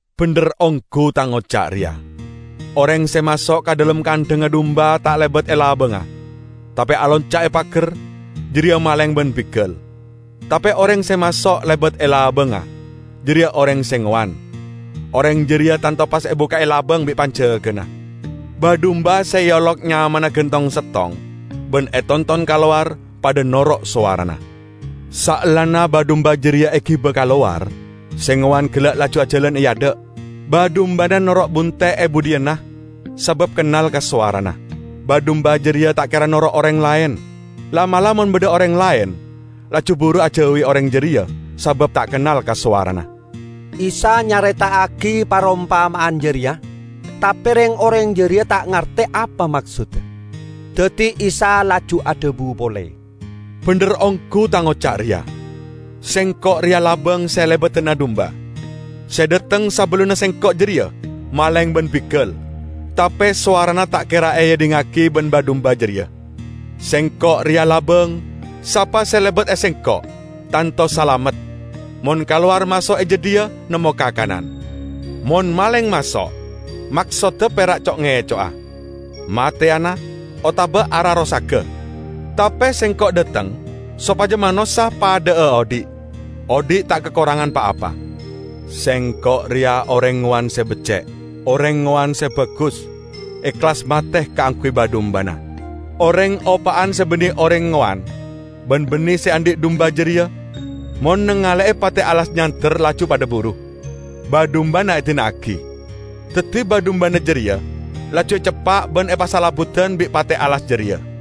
"Bendher onggu Tang oca' reya: Oreng se maso' ka dhalem kandhangnga dumba ta' lebat e labangnga, tape alonca' e pagar, jareya maleng ban bigal. Tape oreng se maso' lebat e labangnga, jareya oreng se ngowan. Oreng jareya tanto pas ebukka'e labang bi' panjagana; ba-dumba se eolok nyamana gan tong-settong ban etonton kalowar padha noro' sowarana. Saellana ba-dumba jareya egiba kalowar, se ngowan gella' laju ajalan e adha', ba-dumbana noro' bunte' e budhiyanna sabab kennal ka sowarana. Ba-dumba jareya ta' kera noro' oreng laen, la'-mala' mon badha oreng laen laju buru ajauwi oreng jareya sabab ta' kennal ka sowarana." Isa nyareta'agi parompama'an jareya, tape reng-oreng jareya ta' ngarte apa maksodda. Daddi Isa laju adhabu pole, "Bendher onggu Tang oca' reya: Sengko' reya labang se elebadana dumba. Se dhateng sabellunna Sengko' jareya maleng ban bigal, tape sowarana ta' kera eedhingngagi ban ba-dumba jareya. Sengko' reya labang. Sapa se lebat e Sengko' tanto salamet, mon kalowar maso' e jadhiya nemmo kakanan. Mon maleng maso' maksodda pera' co'-ngeco'a, mateyana otaba ararosaga. Tape Sengko' dhateng sopaja manossa padha'a odhi' -- odhi' ta' kakorangan pa-apa. Sengko' reya oreng ngowan se becce'. Oreng ngowan se bagus, ehlas mate kaangguy ba-dumbana. Oreng opa'an se banne oreng ngowan ban banne se andhi' dumba jareya, mon nangale'e pate' alas nyander laju padha buru, ba-dumbana edina'agi. Daddi ba-dumbana jareya laju eceppa' ban epasalebbudan bi' pate' alas jareya.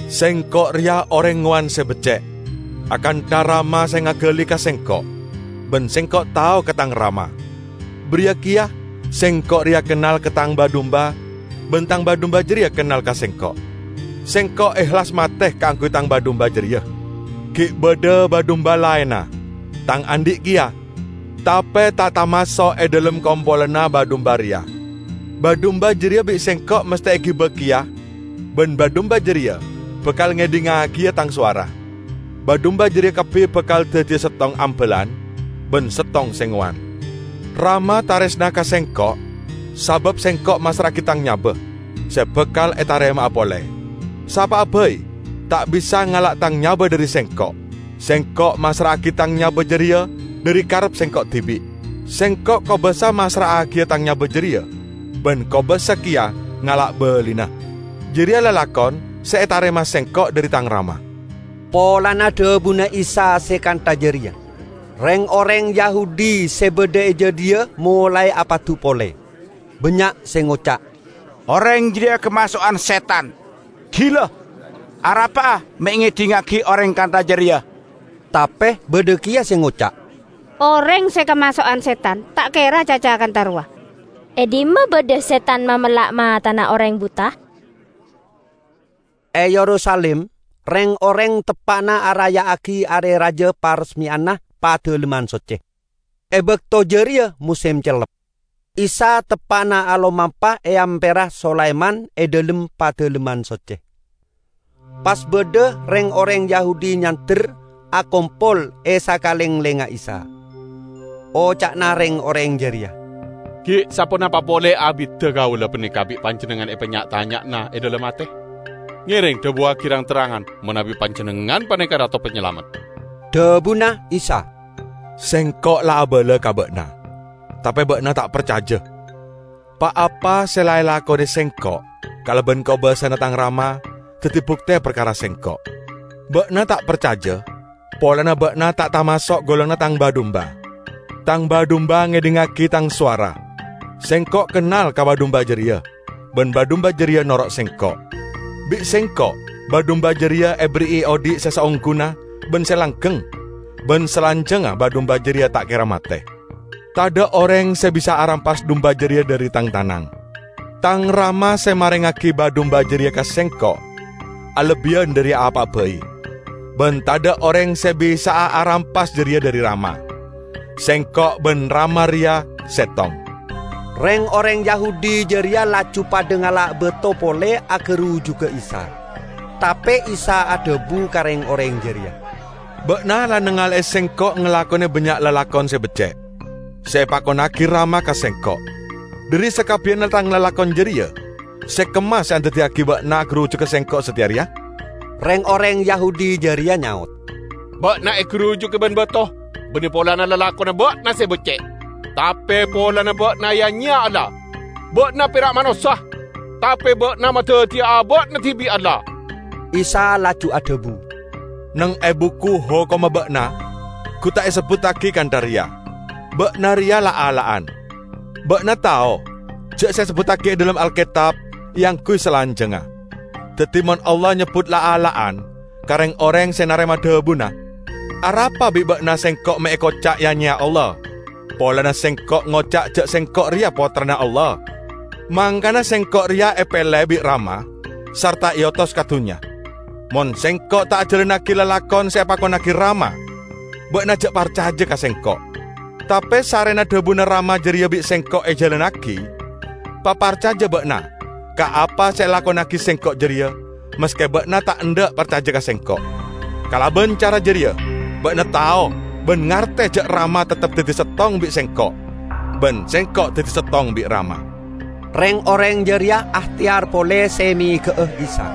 Sengko' reya oreng ngowan se becce'. Akantha Rama se ngagali ka Sengko' ban Sengko' tao ka Tang Rama, bariya keya Sengko' reya kennal ka Tang ba-dumba ban Tang ba-dumba jareya kennal ka Sengko'. Sengko' ehlas mate kaangguy Tang ba-dumba jareya. Gi' badha ba-dumba laenna, Tang andhi' keya, tape ta' tamaso' e dhalem kompolanna ba-dumba reya. Ba-dumba jareya bi' Sengko' masthe egiba keya ban ba-dumba jareya bakal ngedhingngagiya Tang sowara. Ba-dumba jareya kabbi bakal daddiya settong ambalan ban settong se ngowan. Rama taresna ka Sengko' sabab Sengko' massra'agi Tang nyaba, se bakal etarema'a pole. Sapa'a bai ta' bisa ngala' Tang nyaba dhari Sengko'. Sengko' massra'agi Tang nyaba jareya dhari karep Sengko' dibi'. Sengko' kobasa massra'agiya Tang nyaba jareya, ban kobasa keya ngala' balina. Jareya lalakon se etarema Sengko' dhari Tang Rama." Polana dhabuna Isa se kantha jareya, reng-oreng Yahudi se badha e jadhiya molae apadu pole. Bannya' se ngoca', "Oreng jareya kamaso'an setan! Gila! Arapa'a me' ngedhingngagi oreng kantha jareya?" Tape badha keya se ngoca', "Oreng se kamaso'an setan ta' kera acaca kantha rowa! E dhimma badha setan mamella' matana oreng buta?" E Yerusalim reng-oreng teppa'na araya'agi Are Raja Paresmeyanna Padalemman Socce. E bakto jareya mosem cellep. Isa teppa'na alomampa e Amperra Sulaiman e dhalem Padalemman Socce, pas badha reng-oreng Yahudi nyander akompol e sakalenglengnga Isa. Oca'na reng-oreng jareya, "Gi' saponapa pole abidda kaula paneka bi' Panjennengngan epanya'-tanya'ana e dhalem ate? Ngereng dhabuwagi rang-terrangan manabi Panjennengngan paneka Rato Panyalamet." Dhabuna Isa, "Sengko' la abala ka ba'na, tape ba'na ta' parcaja. Pa-apa se la elakone Sengko' kalaban kobasana Tang Rama, daddi bukte parkara Sengko'. Ba'na ta' parcaja polana ba'na ta' tamaso' golonganna Tang ba-dumba. Tang ba-dumba ngedhingngagi Tang sowara. Sengko' kennal ka ba-dumba jareya, ban ba-dumba jareya noro' Sengko'. Bi' Sengko' ba-dumba jareya eberri'i odhi' se saongguna ban se langgeng, ban salanjangnga ba-dumba jareya ta' kera mate. Tadha' oreng se bisa arampas dumba jareya dhari Tang tanang. Tang Rama, se marengngagi ba-dumba jareya ka Sengko', alebbiyan dhari apa'a bai. Ban tadha' oreng se bisa'a arampas jareya dhari Rama. Sengko' ban Rama reya settong." Reng-oreng Yahudi jareya laju padha ngala' bato pole agarujuga Isa. Tape Isa adhabu ka reng-oreng jareya, "Ba'na la nangale'e Sengko' ngalakone bannya' lalakon se becce', se epakonnagi Rama ka Sengko'. Dhari sakabbiyanna Tang lalakon jareya se kemma se andaddiyagi ba'na agarujuga Sengko' sateya reya?" Reng-oreng Yahudi jareya nyaot, "Ba'na egarujuga ban bato banne polana lalakonna ba'na se becce', tape polana ba'na ya-nyeya Allah. Ba'na pera' manossa, tape ba'na madaddiya aba'na dibi' Allah." Isa laju adhabu, "Neng e Buku Hokomma ba'na gu ta' esebbuttagi kantha reya: 'Ba'na reya la'-alla'an?' Ba'na tao ja' se esebbuttagi e dhalem Alketab eangguy salanjangnga. Daddi, mon Allah nyebbut 'la'-alla'an' ka reng-oreng se narema dhabuna, arapa bi' ba'na Sengko' me' ekoca' ya-nyeya Allah polana Sengko' ngoca' ja' Sengko' reya Pottrana Allah? Mangkana Sengko' reya epele bi' Rama sarta eotos ka dunnya. Mon Sengko' ta' ajalannagi lalakon se epakonnagi Rama ba'na ja' parcaja ka Sengko'. Tape sarrena dhabuna Rama jareya bi' Sengko' ejalannagi, paparcaja ba'na ka apa se elakonnagi Sengko' jareya, maske ba'na ta' endha' parcaja ka Sengko'. Kalaban cara jareya ba'na tao ban ngarte ja' Rama teptep daddi settong bi' Sengko', ban Sengko' daddi settong bi' Rama." Reng-oreng jareya aehteyar pole se mega'a Isa,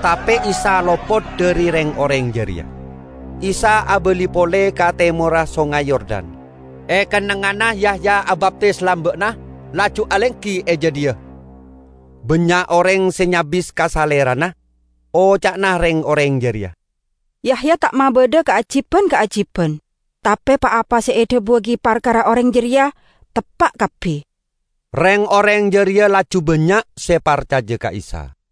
tape Isa lopot dhari reng-oreng jareya. Isa abali pole ka temorra Songay Yordan, e kennengnganna Yahya abaptis lamba'na, laju alenggi e jadhiya. Bannya' oreng se nyabis ka Salerana. Oca'na reng-oreng jareya, "Yahya ta' mabadha kaajiban-kaajiban, tape pa-apa se edhabuwagi parkara oreng reya teppa' kabbi." Reng-oreng jareya laju bannya' se parcaja ka Isa.